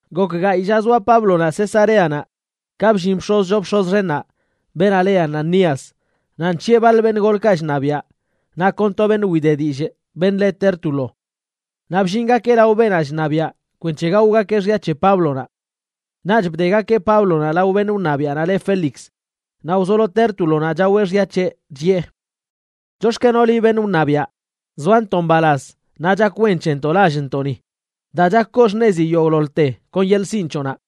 Gok gayꞌ lla zoa Páblonaꞌ Cesareanaꞌ ka bllin bx̱oz choo bx̱oz xennaꞌ, beenaꞌ le Ananías, naꞌ nc̱hiꞌe baḻ beṉꞌ golkaꞌ chṉabiaꞌ naꞌ kon to beṉꞌ wide dillꞌ, beṉꞌ le Tértulo. Naꞌ bllingakeꞌ lao beenaꞌ chṉabiaꞌ kwenc̱he gaogakeꞌ xya c̱he Páblonaꞌ. Naꞌch bdegakeꞌ Páblonaꞌ lao beṉꞌ wṉabiaꞌnaꞌ le Félix naꞌ wzolo Tértulonaꞌ chaweꞌ xya c̱heꞌ, chiꞌe: ―Chox̱kenoꞌ liꞌ, beṉꞌ wṉabiaꞌ, zoantoꞌ mbalaz naꞌ chak wen c̱hentoꞌ lallntoꞌni daa chak koo xṉezi yogꞌḻoḻte kon yeḻꞌ sinꞌ c̱hoꞌnaꞌ.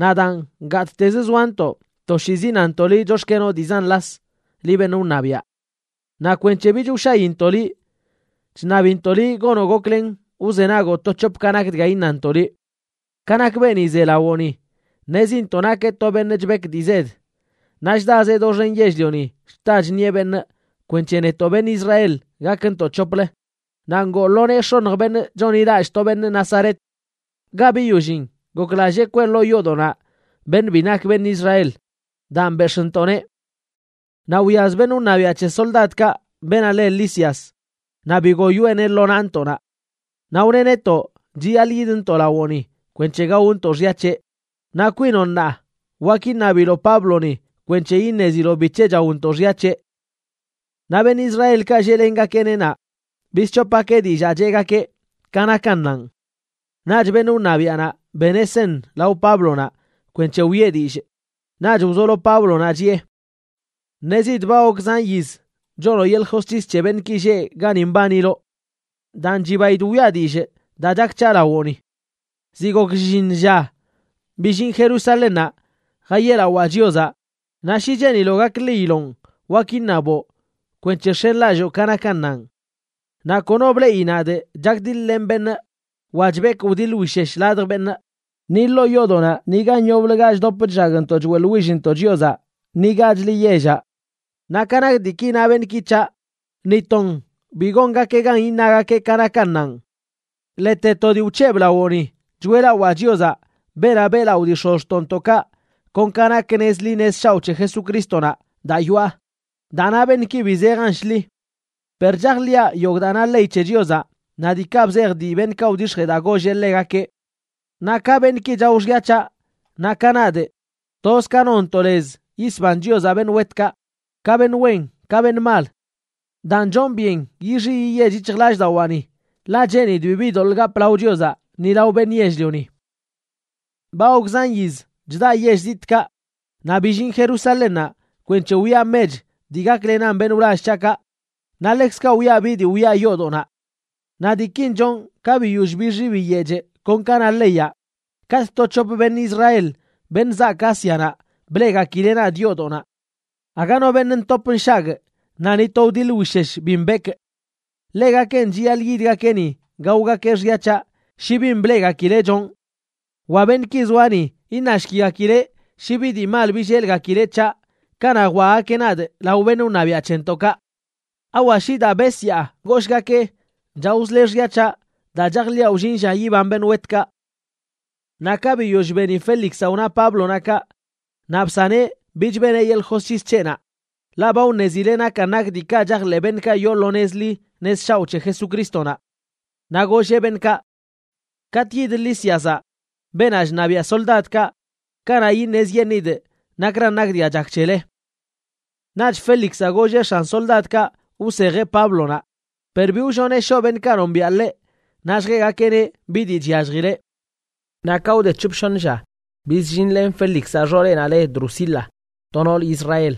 Naꞌ daan, gattez zoantoꞌ toshiizi nantoꞌ liꞌ chox̱kenoꞌ dii zan las, liꞌ beṉꞌ wṉabiaꞌ. Naꞌ kwenc̱he bich wshayintoꞌ liꞌ, chṉabintoꞌ liꞌ gonoꞌ goklen wzenagoꞌ to c̱hop ka nak dga iṉantoꞌ liꞌ. Ka nak beeni ze lawoꞌni, ṉezintoꞌ nakeꞌ to beṉꞌ chbek dii zed, naꞌ chdazeꞌ doxen yell-lioni chta chṉieꞌ beṉꞌ kwenc̱he netoꞌ beṉꞌ Israel gakntoꞌ c̱hoplə, naꞌ ngoo lo nee x̱oṉj beṉꞌ chonḻilallꞌ to beṉꞌ Nazaret. Ga biyollin, goklallee kwee ḻoo yoodoꞌnaꞌ beṉꞌ bi nak beṉꞌ Israel. Daan bex̱ꞌntoꞌneꞌ. Naꞌ wyaz beṉꞌ wṉabiaꞌ c̱he soldadkaꞌ, beenaꞌ le Lisias, naꞌ bigoyoeꞌneꞌ lo naꞌntoꞌnaꞌ. Naꞌ wneꞌ netoꞌ chiyaḻꞌ yidntoꞌ lawoꞌni kwenc̱he gaontoꞌ xya c̱heꞌ. Naꞌ kwinoꞌ ṉaa, wak iṉabiloꞌ Pábloni kwenc̱he iṉeziloꞌ bic̱he chaontoꞌ xya c̱heꞌ. Naꞌ beṉꞌ Israelkaꞌ lleꞌlengakeꞌ naꞌ, bisc̱hopgakeꞌ dillaa cheꞌgakeꞌ: “Ka nakannanꞌ.” Naꞌch beṉꞌ wṉabiaꞌnaꞌ beneꞌ seṉ lao Páblonaꞌ kwenc̱he wiꞌe dillꞌ, naꞌch wzolo Páblonaꞌ chiꞌe: ―Ṉezidꞌ ba gok zan yiz chonoꞌ yeḻꞌ josc̱his c̱he beṉꞌki lleꞌ gani mbaniloꞌ. Daan chibaidꞌ wiꞌa dillꞌ daa chak c̱haꞌ lawoꞌni. Ziꞌ gok shlliṉ lla billinꞌ Jerusalénnaꞌ jayeꞌlawaa Chiozaꞌ, naꞌ shi cheeniloꞌ gakḻiyiloꞌn, wak iṉaboꞌ kwenc̱he x̱enlalloo ka nakannanꞌ. Naꞌ kono bleꞌi nadꞌ chakdiḻ-lenꞌ beṉꞌ wa chbekwꞌ wdiḻ wishesh ladj beṉꞌ, ni ḻoo yoodoꞌnaꞌ ni gan yoblə ga chdop chllagntoꞌ choeꞌḻwillntoꞌ Chiozaꞌ ni gachli yellaꞌ. Naꞌ ka nak diiki na beṉꞌki c̱haꞌ, ni ton bi gongakeꞌ gan iṉagakeꞌ ka nakannanꞌ. Ḻete to dii wc̱hebꞌ lawoꞌni choeꞌlawaa Chiozaꞌ, beenaꞌ beꞌlaꞌo dii x̱ozxtoꞌntoꞌkaꞌ, kon ka nak nez ḻi nez shaoꞌ c̱he Jesucrístonaꞌ daa yoꞌa, daa na beṉꞌki bi zejan shḻi. Per chajḻiꞌa yogꞌ daa na ley c̱he Chiozaꞌ naꞌ diikaꞌ bzej dii beṉꞌkaꞌ wdix̱jee daa golleꞌ ḻegakeꞌ. Naꞌ ka beṉꞌki chao xya c̱haꞌ naꞌ ka nadꞌ, toz ka nonntoꞌ lez yisban Chiozaꞌ beṉꞌ wetkaꞌ, ka beṉꞌ wen ka beṉꞌ mal. Daan chonꞌ byen yixi yiyech yic̱hjlallꞌdawaani, ḻaꞌ cheenidꞌ bibi doḻꞌ gapꞌ lao Chiozaꞌ ni lao beṉꞌ yell-lioni. ’Ba gok zan yiz chdaꞌ yell zitꞌkaꞌ, naꞌ billinꞌ Jerusalénnaꞌ kwenc̱he wiꞌa mech dii gaklenan beṉꞌ wlall c̱haꞌkaꞌ naꞌ ḻekzkaꞌ wiꞌa bi dii wiꞌa yoodoꞌnaꞌ. Naꞌ diikin chonꞌ ka biyoll bixi biyechꞌ kon ka na leyaꞌ, katꞌ to c̱hop beṉꞌ Israel, beṉꞌ zaak Ásianaꞌ, bleꞌgakileꞌ nadꞌ yoodoꞌnaꞌ. Aga no beṉꞌ ntop nshagꞌ naꞌ ni to wdiḻ wishesh bi mbekꞌ. Ḻegakenꞌ chiyaḻꞌ yidgakeꞌ ni gaogakeꞌ xya c̱haꞌ shi bin bleꞌgakileꞌ chonꞌ. Wa beṉꞌki zoa ni, iṉashkigakeꞌ shi bi dii mal billelgakileꞌ c̱haꞌ kanaꞌ jwaꞌgakeꞌ nadꞌ lao beṉꞌ wṉabiaꞌ c̱hentoꞌkaꞌ. ¿Awa shi daa besyaa goshgakee: “Chaozle xya c̱haꞌ daa chajḻiꞌa wllin lla yiban beṉꞌ wetkaꞌ”? Naꞌ ka biyoll beni Félixaꞌ wna Páblonaꞌ kaꞌ, naꞌ bsaneꞌ bich beneꞌ yeḻꞌ josc̱his c̱heꞌnaꞌ, ḻaꞌ ba wṉezileꞌ nakan nak diikaꞌ chajḻeꞌ beṉꞌkaꞌ yoo lo nez ḻi nez shaoꞌ c̱he Jesucrístonaꞌ. Naꞌ golleꞌ beṉꞌkaꞌ: ―Katꞌ yid Lísiazaꞌ, beenaꞌ chṉabiaꞌ soldadkaꞌ, kanaꞌ iṉezyeṉꞌidꞌ nakran nak dga chak c̱hele. Naꞌch Félixaꞌ golleꞌ x̱an soldadkaꞌ wsejeꞌ Páblonaꞌ, per bi wlloneꞌ shoꞌ beṉꞌkaꞌ nombiaꞌ ḻeꞌ naꞌ lljeꞌgakeꞌneꞌ bi dii chyalljileꞌ. Naꞌ ka wde c̱hop shoṉ lla, bizllinlen Félixaꞌ xooleꞌnaꞌ le Drusila, to nool Israel.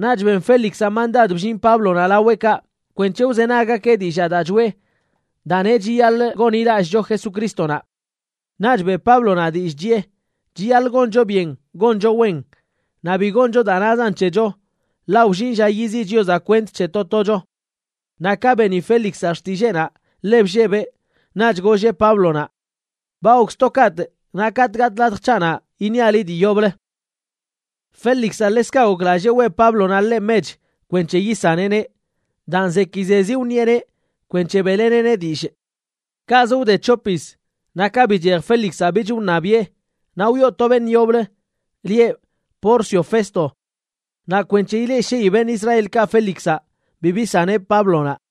Naꞌch ben Félixaꞌ mandad bllin Páblonaꞌ laweꞌkaꞌ kwenc̱he wzenaggakeꞌ dillaa daa choꞌe daa neꞌ chiyaḻꞌ gonḻilallꞌcho Jesucrístonaꞌ. Naꞌch beꞌ Páblonaꞌ dillꞌ chiꞌe chiyaḻꞌ goncho byen goncho wen naꞌ bi goncho daa nazan c̱hecho, ḻaꞌ wllin lla yiziꞌ Chiozaꞌ kwent c̱he to tocho. Naꞌ ka beni Félixaꞌ xtilleenaꞌ, ḻe bllebeꞌ. Naꞌch golleꞌ Páblonaꞌ: ―Ba gokz to kaꞌtꞌ, naꞌ katꞌ gatꞌ latj c̱haꞌnaꞌ iṉiaꞌ liꞌ dii yoblə. Félixaꞌ ḻekzkaꞌ goklallee weꞌ Páblonaꞌ ḻeꞌ mech kwenc̱he yisaneꞌneꞌ. Daan zekizezi wṉieꞌneꞌ kwenc̱he beꞌleneꞌneꞌ dillꞌ. Kaꞌz wde c̱hop yiz, naꞌ ka bichej Félixaꞌ bich wṉabiꞌe naꞌ wyoo to beṉꞌ yoblə lieꞌ Porcio Festo. Naꞌ kwenc̱he ileꞌshii beṉꞌ Israelkaꞌ Félixaꞌ, bi bisaneꞌ Páblonaꞌ.